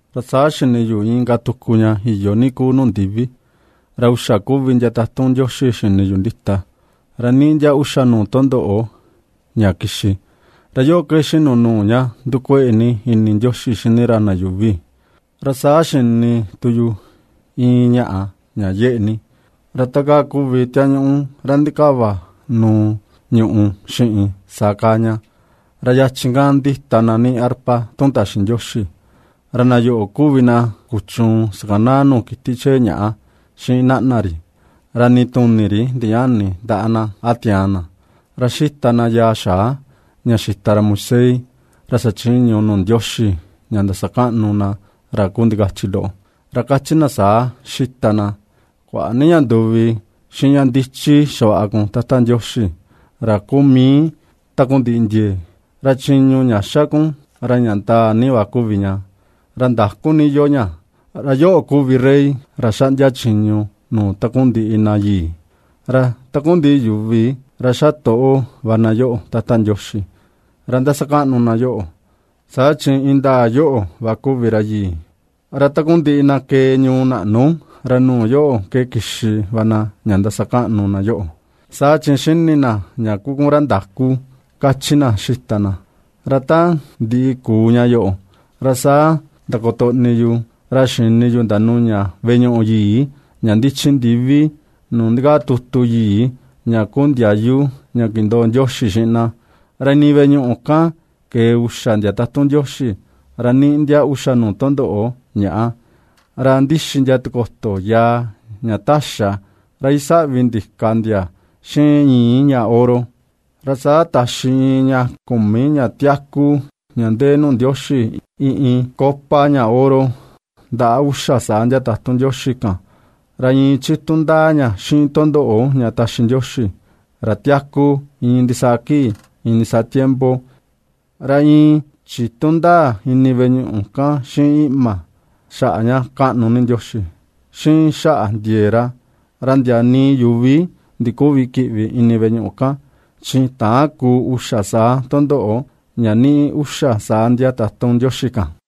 Ra saa xini yu inka tuku ña iyo ni kuu nuu ndivi, ra uxa kuvi ndia tatun Ndioxi xini yu ndita, ra niꞌi ndia uxa nuu tundoꞌo ña kixi; ra yoꞌo ke ^xinu nuu ña ndukueꞌe ni ini Ndioxi xini ra na yuuvi. Ra saa xini tu yu iin ñaꞌa ña yeꞌe ni, ra ta kaa kuvi tiañuꞌu ra ndikavanuu ñùꞌù xiꞌin, saa kaa ña; ra yachi kan ndita na ^niꞌi arpa tun taxi Ndioxi, ra na yoꞌo kuvi na kuchuun xakanaa nuu kiti chee ñaꞌa xiꞌin naꞌna ri, ra nii tuni ri ndiñäni ndaꞌa na, a tiaan na. Ra ^xita na yaa xaa ña xita ra Moisés ra xachiñu nuu Ndioxi, ña ndasakaꞌnu na ra kuu ndikachi loꞌo, ra kachi na saa xita na: Kuaꞌa ni ña nduvi, xiꞌin ña ndichi xavaꞌa kun Tata Ndioxi, ra kuu mii takundiꞌi ndiee, ra chiñu ña xa kun, ra ña ndaa ni va kuvi ña, ra ndaku ni iyoo ña, ra yoꞌo kuvi rey ra xaꞌndia chiñu nuu takundiꞌi na yii. Ra takundiꞌi yuvi ra ^xatoꞌo va na yoꞌo, Tata Ndioxi, ra ^ndasakaꞌnu na yoꞌo, saa chi indaa yoꞌo va kuvi ra yii. Ra takundiꞌi na kee ñuu naꞌnu, ra nuu yoꞌo ke kixi va na ña ndasakaꞌnu na yoꞌo, saa chi ^xini na ña kuu kun ra ndakú ^kachi na ^xita na. Ra ta ndiꞌi kuu ña yoꞌo, ra saa ndakutoꞌni yu, ra xini yu ndanuña veꞌe ñuꞌu yii ña ndichi ndivi nuu ndikaa tutu yii ña kuu ndiayu ña kindoo Ndioxi xiꞌin na. Ra ini veꞌe ñuꞌu kan kee uxa ndia tatun Ndioxi, ra ^niꞌi ndia uxa nuu tundoꞌo ñàꞌa. Ra ^ndixi ndia tikoto yaa ña taxa, ra isaꞌvi ndika ndia xiꞌin ñi̱i̱ ña oro. Ra saa taxi iin ña kumi ña tiaku, ña ndee nuu Ndioxi, iin iin copa ña oro ndaꞌa uxa saa ndia tatun Ndioxi kan, ra iin chitu ndaa ña xiꞌin tundoꞌo ña taxi Ndioxi, ra tiaku iin ndisaa kii, iin ndisaa tiempo. Ra iin chitu ndaa ini veꞌe ñuꞌu kan xiꞌin iꞌma, xaꞌa ña kaꞌnu ni Ndioxi, xiꞌin xaꞌa ndiee ra. Ra ndia nii yuvi ndiküvi kiꞌvi ini veꞌe ñuꞌu kan, chi täan kuu uxa saa tundoꞌo ña niꞌi uxa saa ndia tatun Ndioxi kan.